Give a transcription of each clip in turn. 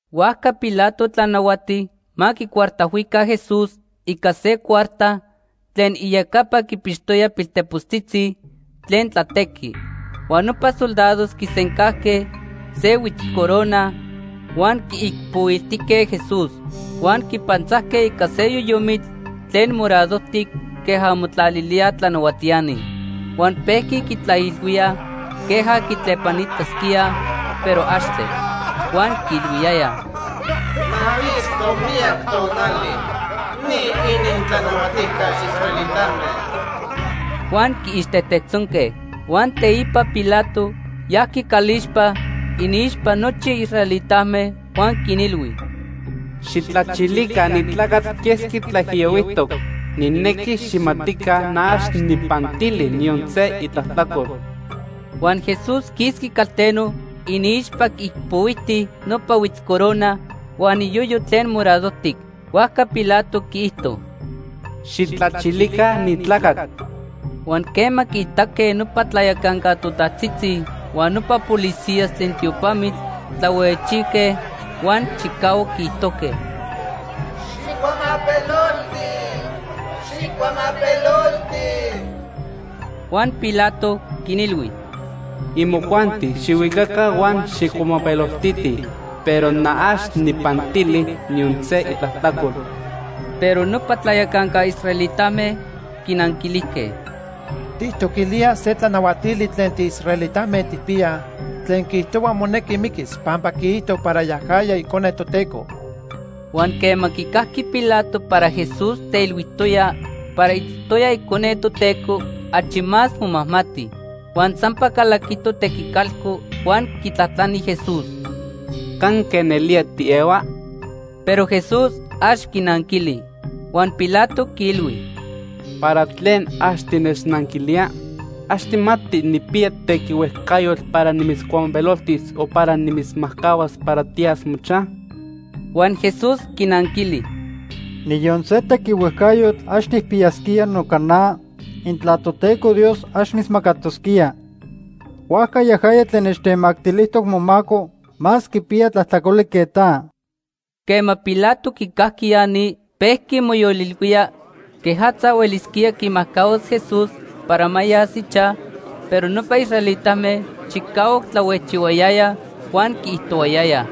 Huajca Pilato tlanahuati ma quicuartajhuica Jesús ica se cuarta tlen iyecapa quipixtoya piltepostzitzi tlen tlatequi. Huan nopa soldados quisencajque se huitzcorona huan quiicpohuiltijque Jesús. Huan quipantzajque ica se yoyomitl tlen moradojtic queja motlalilíaj tlanahuatiani. Huan pejque quitlaijilhuíaj queja quitlepanitasquíaj, pero axtle. Huan quiilhuiyayaj: ―¡Ma itzto miyac tonali ni inintlanahuatijca israelitame! Huan quiixtejtejtzonque. Huan teipa Pilato yajqui calixpa iniixpa nochi israelitame huan quinilhui: ―Xijtlachilica ni tlacatl quesqui tlaijiyohuijtoc. Nijnequi xijmatica na ax nijpantili niyon se itlajtlacol. Huan Jesús quisqui calteno iniixpa quiicpohuijti nopa huitzcorona huan iyoyo tlen moradojtic. Huajca Pilato quiijto: ―Xijtlachilica ni tlacatl. Huan quema quiitaque nopa tlayacanca totajtzitzi huan nopa policías tlen tiopamitl, tlahuejchijque huan chicahuac quiijtojque: ―¡Xijcuamapelolti! ¡Xijcuamapelolti! Huan Pilato quinilhui: ―Imojuanti xijhuicaca huan xijcuamapeloltitij, pero na ax nijpantili niyon se itlajtlacol. Pero nopa tlayacanca israelitame quinanquilijque: ―Tijtoquilíaj se tlanahuatili tlen tiisraelitame tijpiyaj tlen quiijtohua monequi miquis pampa quiijto para yajaya Icone Toteco. Huan quema quicajqui Pilato para Jesús teilhuijtoya para itztoya Icone Toteco, achi más momajmati. Huan sampa calaquito tequicalco huan quitlajtlani Jesús: ―¿Canque nelía tiehua? Pero Jesús ax quinanquili. Huan Pilato quiilhui: ―¿Para tlen ax tinechnanquilía? ¿Ax tijmati nijpiya tequihuejcayotl para nimitzcuamapeloltis o para nimitzmajcahuas para tiyas mochaj? Huan Jesús quinanquili: ―Niyon se tequihuejcayotl ax tijpiyasquía noca na intla Toteco Dios ax mitzmacatosquía. Huajca yajaya tlen nechtemactilijtoc momaco más quipiya tlajtlacoli que ta. Quema Pilato quicajqui ya ni, pejqui moyolilhuía quejatza huelisquía quimajcahuas Jesús para ma yas ichaj, pero nopa israelitame chicahuac tlahuejchihuayayaj huan quiijtohuayayaj: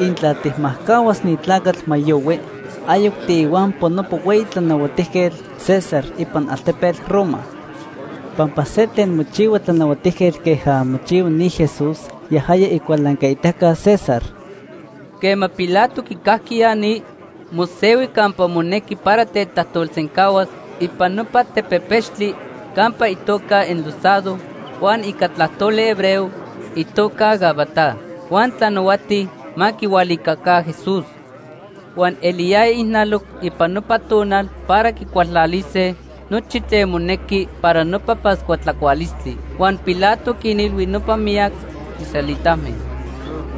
―Intla tijmajcahuas ni tlacatl ma yohui, ayoc tiihuampo nopa hueyi tlanahuatijquetl César ipan altepetl Roma. Pampa se tlen mochihua tlanahuatijquetl queja mochihua ni Jesús, yajaya icualancaitaca César. Quema Pilato quicajqui ya ni, mosehui campa monequi para tetlajtolsencahuas ipan nopa tepejpechtli campa itoca Enlosado huan ica tlajtoli hebreo itoca Gabata. Huan tlanahuati ma quihualicaca Jesús. Huan eliyaya ijnaloc ipan nopa tonal para quicualtlalise nochi tlen monequi para nopa Pascua tlacualistli. Huan Pilato quinilhui nopa miyac israelitame: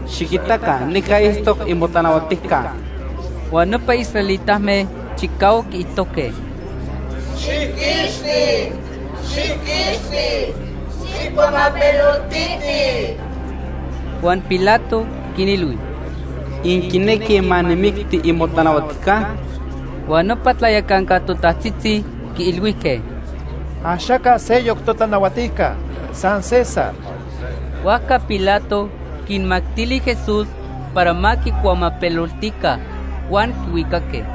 ―Xiquitaca nica itztoc imotlanahuatijca. Huan nopa israelitame chicahuac quiijtojque: ―¡Xijquixti, xijquixti, xijcuamapeloltiti! Huan Pilato quinilhui: ―¿Inquinequij ma nijmicti imotlanahuatijca? Huan nopa tlayacanca totajtzitzi quiilhuijque: ―Axaca seyoc totlanahuatijca, san César. Huajca Pilato quinmactili Jesús para ma quicuamapeloltica huan quihuicaque.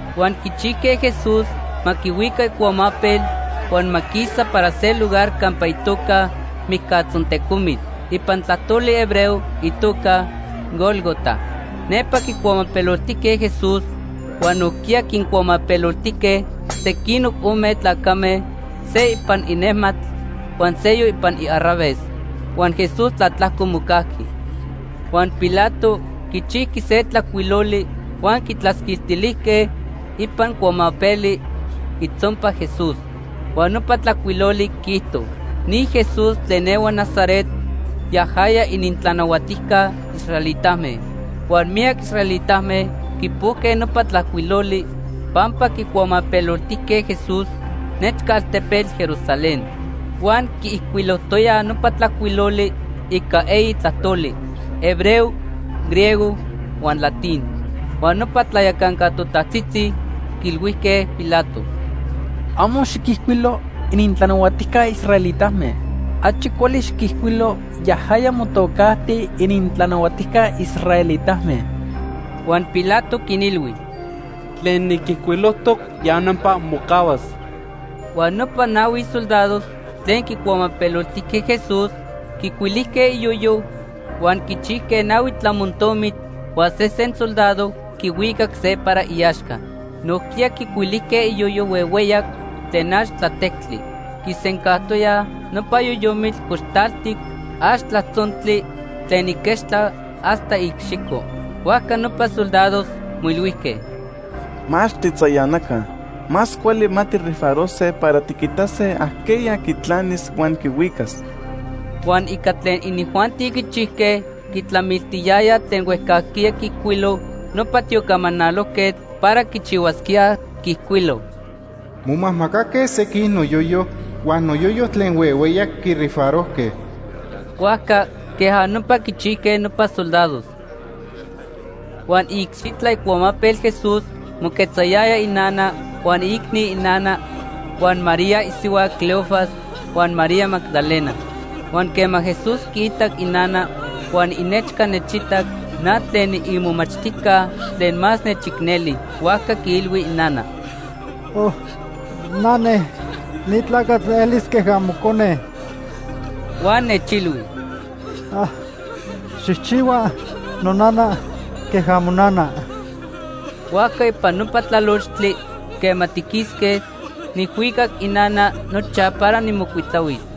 Huan quichijque Jesús ma quihuica icuamapel huan ma quisa para se lugar campa itoca “Mijcatzontecomitl” (ipan tlajtoli hebreo itoca Gólgota). Nepa quicuamapeloltijque Jesús huan nojquiya quincuamapeloltijque sequinoc ome tlacame, se ipan inejmatl huan seyoc ipan iarraves huan Jesús tlatlajco mocajqui. Huan Pilato quichijqui se tlajcuiloli huan quitlatzquiltijque ipan cuamapeli itzonpac Jesús. Huan nopa tlajcuiloli quiijto: NI JESÚS TLEN EHUA NAZARET, YAJAYA ININTLANAHUATIJCA ISRAELITAME. Huan miyac israelitame quipojque nopa tlajcuiloli pampa quicuamapeloltijque Jesús nechca altepetl Jerusalén. Huan quiijcuilojtoyaj nopa tlajcuiloli ica eyi tlajtoli; hebreo, griego huan latín. Huan nopa tlayacanca totajtzitzi quiilhuijque Pilato: ―Amo xiquijcuilo: ‘Inintlanahuatijca israelitame.’ Achi cuali xiquijcuilo: ‘Yajaya motocajti inintlanahuatijca israelitame.’ Huan Pilato quinilhui: ―Tlen niquijcuilojtoc, ya nopa mocahuas. Huan nopa nahui soldados tlen quicuamapeloltijque Jesús quicuilijque iyoyo huan quichijque nahui tlamontomitl huan sesen soldado quihuicac se para iaxca. Nojquiya quicuilijque iyoyo huehueyac tlen ax tlatectli. Quisencajtoyaj nopa yoyomitl coxtaltic, ax tlajtzontli tlen iquechtla hasta iicxico. Huajca nopa soldados moilhuijque: ―Ma ax tijtzayanaca. Más cuali ma tijrifarose para tiquitase ajqueya quitlanis huan quihuicas. Huan ica tlen inijuanti quichijque quitlamiltiyayaj tlen huejcajquiya quiijcuilo nopa tiocamanalojquetl para quichihuasquíaj. Quiijcuilo: “Momajmacaque sequin noyoyo huan noyoyo tlen huehueyac, quirifarojque.” Huajca queja nopa quichijque nopa soldados. Huan iicxitla icuamapel Jesús moquetzayayaj inana, huan iicni inana, huan María isihua Cleofas huan María Magdalena. Huan quema Jesús quiitac inana huan inechca nechitac na tlen niimomachtijca tlen más nechicneli, huajca quiilhui inana: ―Nane, ni tlacatl elis queja mocone. Huan nechilhui: ―Xijchihua nonana queja monana. Huajca ipan nopa tlalochtli quema tiquisque, nijhuicac inana nochaj para nijmocuitlahuis.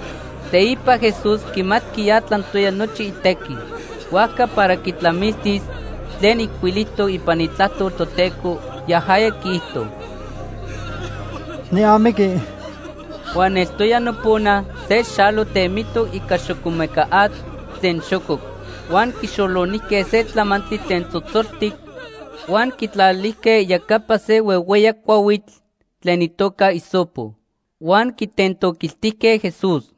Teipa Jesús quimatqui ya tlantoya nochi itequi. Huajca para quitlamiltis tlen ijcuilijtoc ipan Itlajtol Toteco, yajaya quiijto: ―Niamiqui. Huan eltoya nopona se xalo temitoc ica xocomeca atl tlen xococ. Huan quixolonijque se tlamantli tlen tzotzoltic huan quitlalijque iyecapa se huehueyac cuahuitl tlen itoca hisopo. Huan quitentoquiltijque Jesús.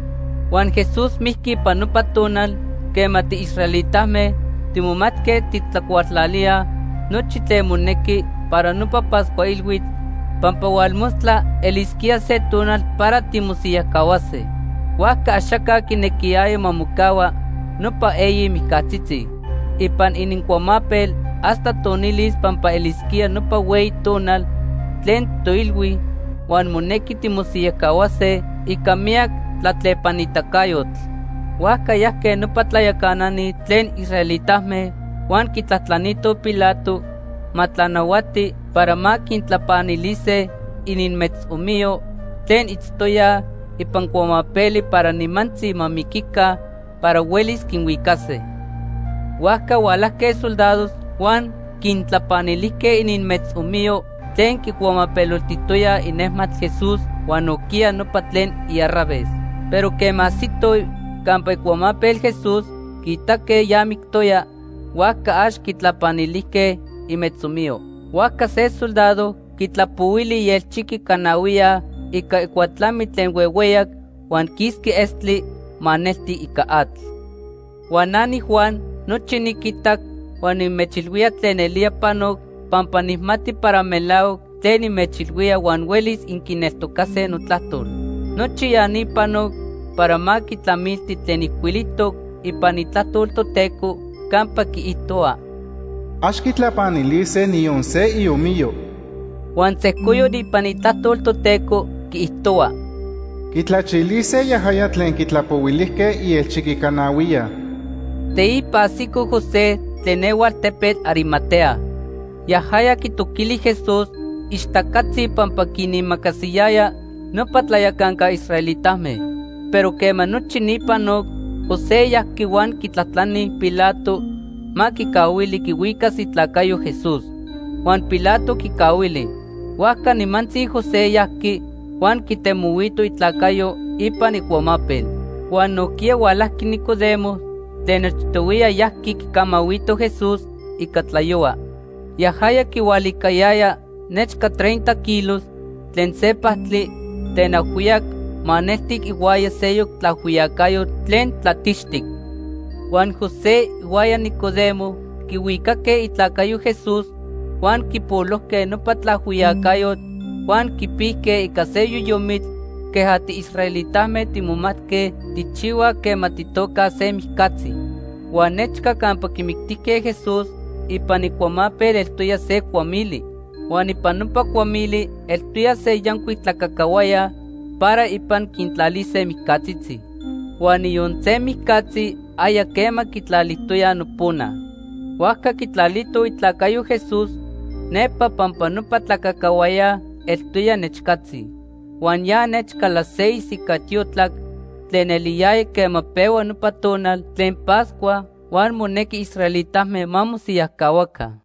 Huan Jesús mijqui ipan nopa tonal quema tiisraelitame timomatque titlacualtlalíaj nochi tlen monequi para nopa Pascua Ilhuitl pampa hualmostla elisquía se tonal para timosiyajcahuase. Huajca axaca quinequiyaya ma mocahuaca nopa eyi mijcatzitzi ipan inincuamapel hasta tonilis pampa elisquía nopa hueyi tonal tlen toilhui huan monequi timosiyajcahuase ica miyac tlatlepanitacayotl. Huajca yajque nopa tlayacanani tlen israelitame huan quitlajtlanitoj Pilato ma tlanahuati para ma quintlapanilise ininmetzomiyo tlen itztoyaj ipan cuamapeli para nimantzi ma miquica para huelis quinhuicase. Huajca hualajque soldados huan quintlapanilijque ininmetzomiyo tlen quincuamapeloltijtoyaj inejmatl Jesús huan nojquiya nopa tlen iarraves. Pero quema ajsitoj campa icuamapel Jesús, quiitaque ya mictoya, huajca ax quitlapanilijque imetzomiyo. Huajca se soldado quitlapohuili ielchiquicanahuiya ica icuatlami tlen huehueyac huan quisqui estli maneltic ica atl. Huan na niJuan nochi niquitac, huan nimechilhuía tlen nelía panoc pampa nijmati para melahuac tlen nimechilhuía huan huelis inquineltocase notlajtol. Nochi ya ni panoc para ma quitlamilti tlen ijcuilijtoc ipan Itlajtol Toteco campa quiijtohua: “Ax quitlapanilise niyon se iomiyo.” Huan sejcoyoc ipan Itlajtol Toteco quiijtohua: “Quitlachilise yajaya tlen quitlapohuilijque ielchiquicanahuiya.” Teipa ajsico José tlen ehua altepetl Arimatea. Yajaya quitoquili Jesús ixtacatzi pampa quinimacasiyaya nopa tlayacanca israelitame. Pero quema nochi ni panoc, José yajqui huan quitlajtlani Pilato ma quicahuili quihuicas itlacayo Jesús. Huan Pilato quicahuili. Huajca nimantzi José yajqui huan quitemohuito itlacayo ipan icuamapel. Huan nojquiya hualajqui Nicodemo tlen achtohuiya yajqui quicamahuito Jesús ica tlayohua. Yajaya quihualicayaya nechca treinta kilos tlen se pajtli tlen ajhuiyac maneltic ihuaya seyoc tlaajhuiyacayotl tlen tlatixtic. Huan José ihuaya Nicodemo quihuicaque itlacayo Jesús, huan quipolojque nopa tlaajhuiyacayotl huan quipijque ica se yoyomitl queja tiisraelitame timomatque tijchihuaj quema tijtocaj se mijcatzi. Huan nechca campa quimictijque Jesús ipan icuamapel eltoya se cuamili. Huan ipan nopa cuamili eltoya se yancuic tlacacahuaya para ipan quintlalise mijcatzitzi. Huan niyon se mijcatzi aya quema quitlalijtoyaj nopona. Huajca quitlalitoj itlacayo Jesús nepa pampa nopa tlacajcahuaya eltoya nechcatzi. Huan ya nechca las seis ica tiotlac tlen eliyaya quema pehua nopa tonal tlen Pascua huan monequi israelitame ma mosiyajcahuaca.